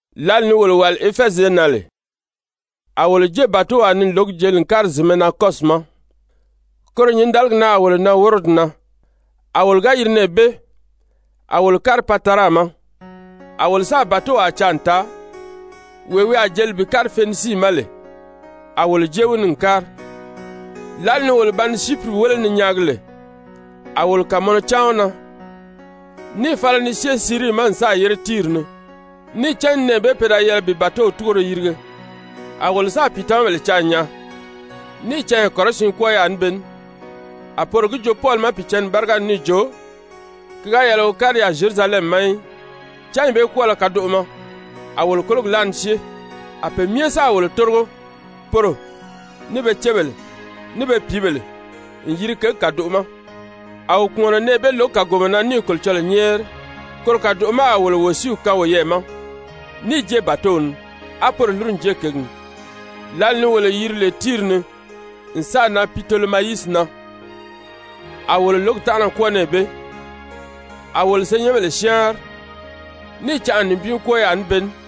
Lǎli ni wolo wàli Efɛzi ye na lè, a wolo jée bàtow ni n lǒgi jeli n kári zìnmɛ na Kɔsi ma, koro nyǐndaligi na a wolo nan Worodi na, a wolo ga yiri nɛɛ bee, a wolo kári Patara ma. A wolo sáà bàtowaa caa n taa, wee wi a jeli bi kári Fenisii ma lè, a wolo jée wi ni n kári. Lǎli ni wolo ba ni Syipiri wéle ni nyaagi lè, a wolo kàmɔnɔ cáan wi na níì fala ni syée Sirii ma n sáà yére Tiiri ni, níì cán nɛɛ bee pe da yɛlɛ bi bàtow túgoro yirige. A wolo sáà pìitamabèle caa n nyaa, níì canya kɔrɔsiin kwɔ́ɔ yaà ní be ní. A poro gi joo Pɔli ma Pìicǎnni báriga ni níì jo ki ga yɛlɛ wi kári yaà Zyerusalɛmi ma í. Cányi bee kwɔ́ɔlɔ kadoʔo ma, a wolo kólogi láa ni syée, a pe myɛ sáà wolo tórigo, poro, ní be cébèle, ní be pìíbèle n yiri kěgi kàdoʔo ma. A wo kpùmɔnɔ nɛɛ bee lǒgi kàgomɔ na níì Kolocɔlɔɔ nyɛ́ɛri. Koro kàdoʔo ma a wolo wòsiiw kaan woyɛɛ ma níì jée bàtow ni, á poro lúru n jée kěgi ni. Lǎli ni wolo yiri lè Tiiri ni n sáà nan Pitolemayisi na, a wolo lǒgi tánʔana kwɔ́ɔ nɛɛ bee, a wolo senyɛnbèle syáanri, níì canʔa nibin kwɔ́ɔ yaà ní be ní.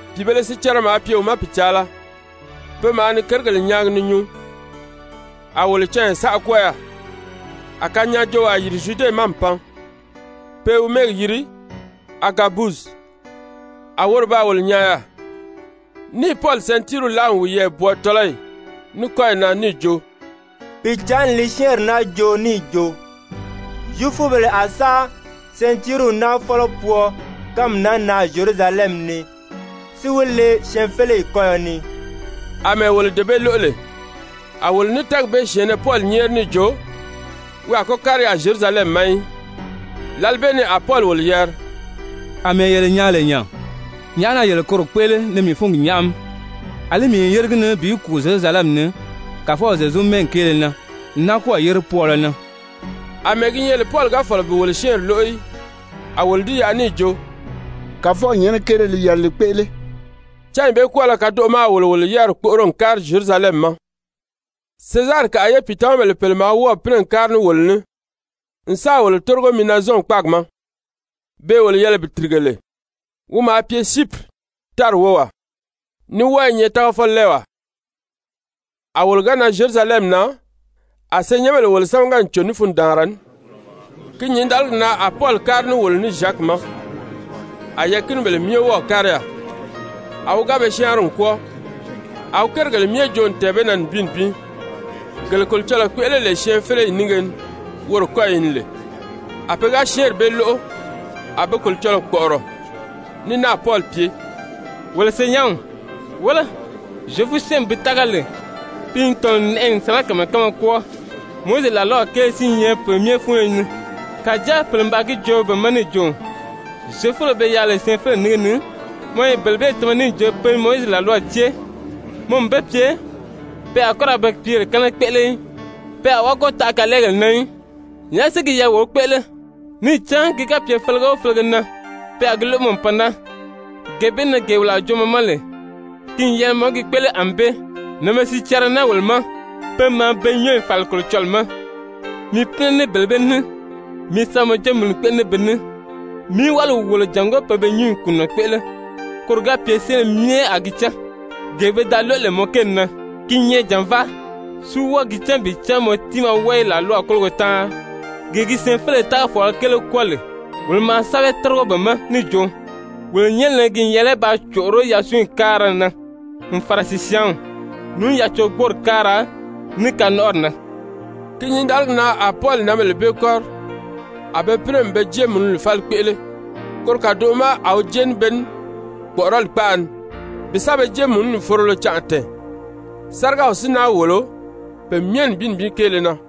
Pìibēle sicɛrɛ maa pye wi ma pìcaala, pe maa ni kérigèle nyaagi ni nyuu. A wolo canya saʔa kwɔ́ɔ yaà, a kanyaajoowaa yìri Zyude ma n pan, pe i wi mɛ́ɛgi yiri Agabusi. A woro baa wolo nyaa yaà, níì Pɔli sɛntiiriw láa n wiyɛɛ bwɔɔ tɔ́lɔyi, ní kɔ́yi na níì jo: «Pìicǎnni li syɛ́ɛnri naa joo níì jo, Zyefubèle a sa sɛntiiriw naa fɔ́lɔ pwɔɔ kánmi naa na Zyerusalɛmi ni, si wi le syɛɛnfeleyi kɔ́yɔ ni.» Amɛɛ wolo dee bee lóʔo lè, a wolo ní tɛ́ɛgi bee syɛ̀ɛnnɛ Pɔli nyɛ́ɛri níì jo wi a kɔ́ kári yaà Zyerusalɛmi ma í. Lǎli bee ni a Pɔli wolo yari: «Amɛɛ yele nyaan lè nya, nyàʔá na yele koro kpéʔele ni mii fúngi nyáʔami? Alí mii n yére gi ni bi kùu Zyerusalɛmi ni Kàfɔw Zyezu mɛ́ɛgi kéele na, n náa kɔ́ɔ̀ yére pwɔɔlɔ na.» Amɛɛ gi nyɛ lè Pɔli ga fɔ̀lɔ bi wolo syɛ́ɛnri lóʔo í, a wolo di yaʔa níì jo: «Kàfɔw nyɛ́nɛ kéele li yɛlɛ li kpéʔele.» Cányi bee kwɔ́ɔlɔ kadoʔo ma a wolo wolo yáriri kpóʔoro n kári Zyerusalɛmi ma. Sezarikaʔa ye pìitamabèle pèle maa wɔ́ɔ̀ pínɛ n kári ní wolo ní n sáà wolo tórigo Minazɔn kpáagi ma, beè wolo yɛlɛ bi tìrige lè, wi maa pye Syipiri tári wówaa, ní wɔ́ɔ i nyɛ tágafɔlɛɛwaa. A wolo ga nan Zyerusalɛmi na, a senyɛnbèle wolo sámaga n cò ní fundaanra ní. Ki nyǐndaligi na a Pɔli kári ní wolo ní Zyaki ma, a yɛɛ̀kinibèle myɛ wɔ́ɔ̀ kári yaà. A wi ga be syáanri n kwɔ́ɔ, a wi kérigèle myɛ joo n tɛ̀ɛn be na nibin nibin, gele Kolocɔlɔɔ kpéʔele lè syɛɛnfeleyi nínge ni woro kɔ́yi ni lè. A pe ga syɛ́ɛnri bee lóʔo, a be Kolocɔlɔɔ kpɔ̀ʔɔrɔ ní náà Pɔli pye: «Wolo senyɛnw, wéle, Zyefu-syɛ́ɛnmi bi tága lè, pi n tɔ̀nɔ n nɛʔɛ n sirakamayɛ kánmaa kwɔ́ɔ, Mowizi làlwaw kéele si i nyɛ pe myɛ fúnyo ni. Kàjáa pèle n baa gi joo be ma níì jo, Zyefubèle be yaà lè syɛɛnfeleyi nínge ni, mɔ i bele bee tama níì jo pe Mowizi làlwaw cée, mɔ n be pye, pe a kɔ́ ra be pìíbèle kɛ́nɛ kpéʔele í, pe a wɔ́ɔ kɔ́ taʔa kalɛɛgèle na í. Nyàʔá si gi yɛlɛ wo kpéʔele? Níì cán ki ga pye felege o felege na pe a gi lóʔo mɔ n pan naa. Gee bee na gee wolo a joo mɔ ma lè, ki n yɛlɛ mɔ í gi kpéʔele ànbée. Nànbēle sicɛrɛ i naa wolo ma, pe maa be nyɔ́ɔyi fàli Kolocɔlɔɔ ma. Mi pínɛ ní bele bee ní, mi sa mɔ jéemununi kpéʔele ní be ní, mí wáliw wòlo jàngó pe be nyúnyi kùnunɔ kpéʔele. Koro ga pye syɛ́ɛnbèle myɛ a gi cán, gee pe da lóʔo lè mɔ kéeli na, ki i nyɛ jànvaa, si wɔ́ɔ gi cán bi cán mɔ tiimaa wɔ́ɔ i làlwaw kólogo táanri. Gee gi syɛɛnfeleyi tágafɔɔlɔ kéele kwɔ́ɔ lè, wolo maa sɛ́bɛw tórigo be ma níì jo, wolo nyɛ́nɛ na ki n yɛlɛ paa còʔoró yasunyi káara na, n fàra sìsyaanw, ní yacorigboori káara, ní kanɔnʔɔri na.» Ki nyǐndaligi na a Pɔli nǎnbèle bee kɔ́ri a be pínɛ n be jéemununi fáli kpéʔele koro kàdoʔo ma a wi jée ní be ní kpɔ̀ʔɔrɔli kpaʔa ni bi sa be jéemununi forolo canʔa tɛ̀ɛn, sárigaw si náa wòlo pe myɛ nibin nibin kéele na.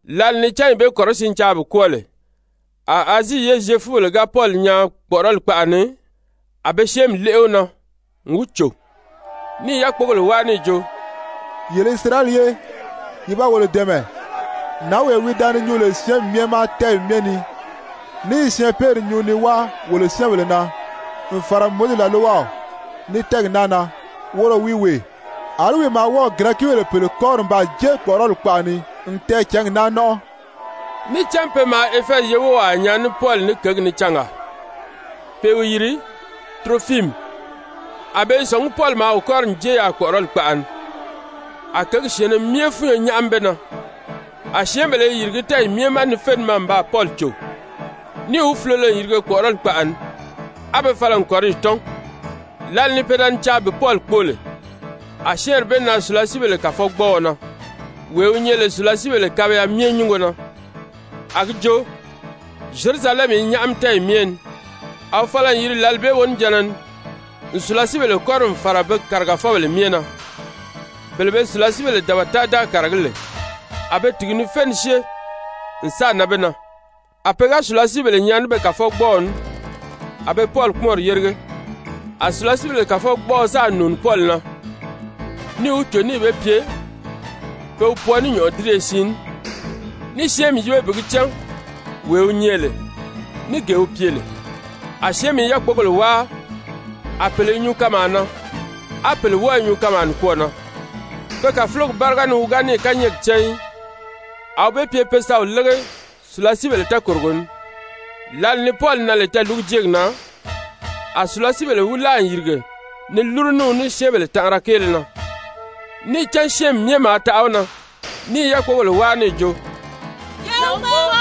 Lǎli ni cányi bee kɔrɔsiin caa bi kwɔ́ɔ lè, a Azii ye Zyefubèle ga Pɔli nyaa kpɔ̀ʔɔrɔli kpaʔa ni, a be syɛ́ɛnmi léʔe wi na n wi cò, ní i yákpogèle wáa níì jo: «Yele Isirayɛli ye, ye ba wolo dɛ̀ɛmɛ! Nǎnwee wi da ni nyuu lè syɛ́ɛnbèle myɛ ma tɛ́ɛyi myɛ ni ní i syɛɛnpeeri nyuu ni wáa wolo syɛ́ɛnbèle na, n fàra Mowizi làlwaw, ní tɛ́ɛgi naa na, woro wi wee. Alí wi maa wɔ́ɔ̀ Girɛkibèle pèle kɔ́ri n baa jée kpɔ̀ʔɔrɔli kpaʔa ni n tɛɛcǎngi naa nɔ́nʔɔ.» (Níì cán pe maa Efɛzi ye wówaa nyaa ní Pɔli ní kěgi ni cangaa, pe i wi yiri Turofimi, a be i sɔ̀ngí Pɔli maa wi kɔ́ri n jée yaà kpɔ̀ʔɔrɔli kpaʔa ni.) A kěgi syɛ̀ɛnnɛ myɛ fúnyo nyáʔami be na, a syɛ́ɛnbèle i yìrigí tɛ́ɛyi myɛ ma ni fé ni maa n baa Pɔli cò, níì wi fulolo n yirige kpɔ̀ʔɔrɔli kpaʔa ni, á be fala n kɔ̀riyi tɔ́n. Lǎli ni pe da ni caa bi Pɔli kpóo lè, a syɛ́ɛnri bee nan sùlasiibèle kàfɔgbɔɔɔ na, wee wi nyɛ lè sùlasiibèle kabiya myɛ nyúngo na, a gi jo, Zyerusalɛmi i nyáʔami tɛ́ɛyi myɛ ni. A wi fala n yiri lǎli bee wonijanna ni n sùlasiibèle kɔ́ri n fàra be kàrigafɔbèle myɛ na, bele be sùlasiibèle dabata-da kàragí lè, a be tìgi tìgi: Tìgiw bee kɔ́rɔ i nyɛ, sùlasiibèle maa pye kpaataʔaga ni. ni fé ni syée n sáà nan be na. A pe ga sùlasiibèle nyaa ní be kàfɔgbɔɔw ní, a be Pɔli kpúmɔnri yérige. A sùlasiibèle kàfɔgbɔɔɔ sáà nùuni Pɔli na níì wi cò níì be pye pe wi pwɔɔ ní nyɔ̀ʔɔdiriye siin ní, níì syɛ́ɛnmi yíbe bi gi cán wee wi nyɛ lè, ní gee wi pye lè. A syɛ́ɛnmi i yákpogèle wáa, a pèle i nyuu kanmaa na, á pèle wɔ́ɔ i nyuu kanmaa nikwɔɔ na. Pe kàfulogi báriga ni wi ga níì kányɛɛgi cán í, a wi be pye pe sa wi lége sùlasiibèle tɛɛkòrogo ni. Lǎli ni Pɔli nan lè tɛɛ̀lúgujeegi na, a sùlasiibèle wi láa n yìrige ni lúru ní wi ní syɛ́ɛnbèle tanʔara kéele na, níì cán syɛ́ɛnmi myɛ maa taʔa wi na ní i yákpogèle wáa níì jo: «Ye wi kpóo!»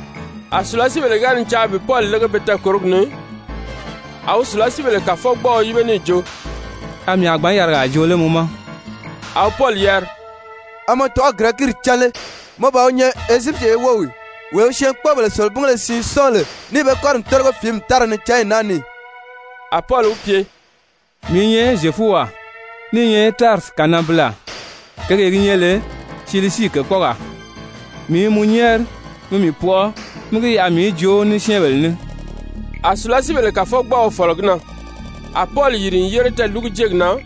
A sùlasiibèle ga ni caa bi Pɔli lége be tɛɛkòrogi ni, a wi sùlasiibèle kàfɔgbɔɔɔ yíbe níì jo: «A mii a gbǎn yarigaa joo lé mɔ ma?» A wi Pɔli yari: «A mɔ tɔ̀ʔɔ̂ Girɛkiiri cán lé? Mɔ ban wi nyɛ Ezyipiti ye wów ì, wee wi syɛɛnkpoobèle selebingéle siin sɔ́ɔn lè níì be kɔ́ri n tórigo fìími tára ni cányi naa ni ì?» A Pɔli wi pye: «Mii i nyɛ Zyefuwaa, ní i nyɛ Tarisi kananbilaa, kěgee gi nyɛ lè Silisii kèkpɔɔgaa. Mii i mɔ nyɛ́ɛri, mi mii pɔʔɔ mí gi yaʔa mii í joo ní syɛ́ɛnbèle ní.» A sùlasiibèle kàfɔgbɔɔɔ fɔ̀lɔ gi na, a Pɔli yìri n yére tɛɛ̀lúgujeegi na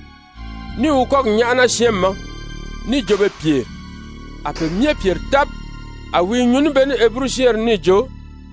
níì wi kɔ́gi nyáʔana syɛ́ɛnmi ma níì jo be pyèri. A pe myɛ pyèri tábi. A wi i nyuu ní be ní Heburu-syɛ́ɛnri ni níì jo: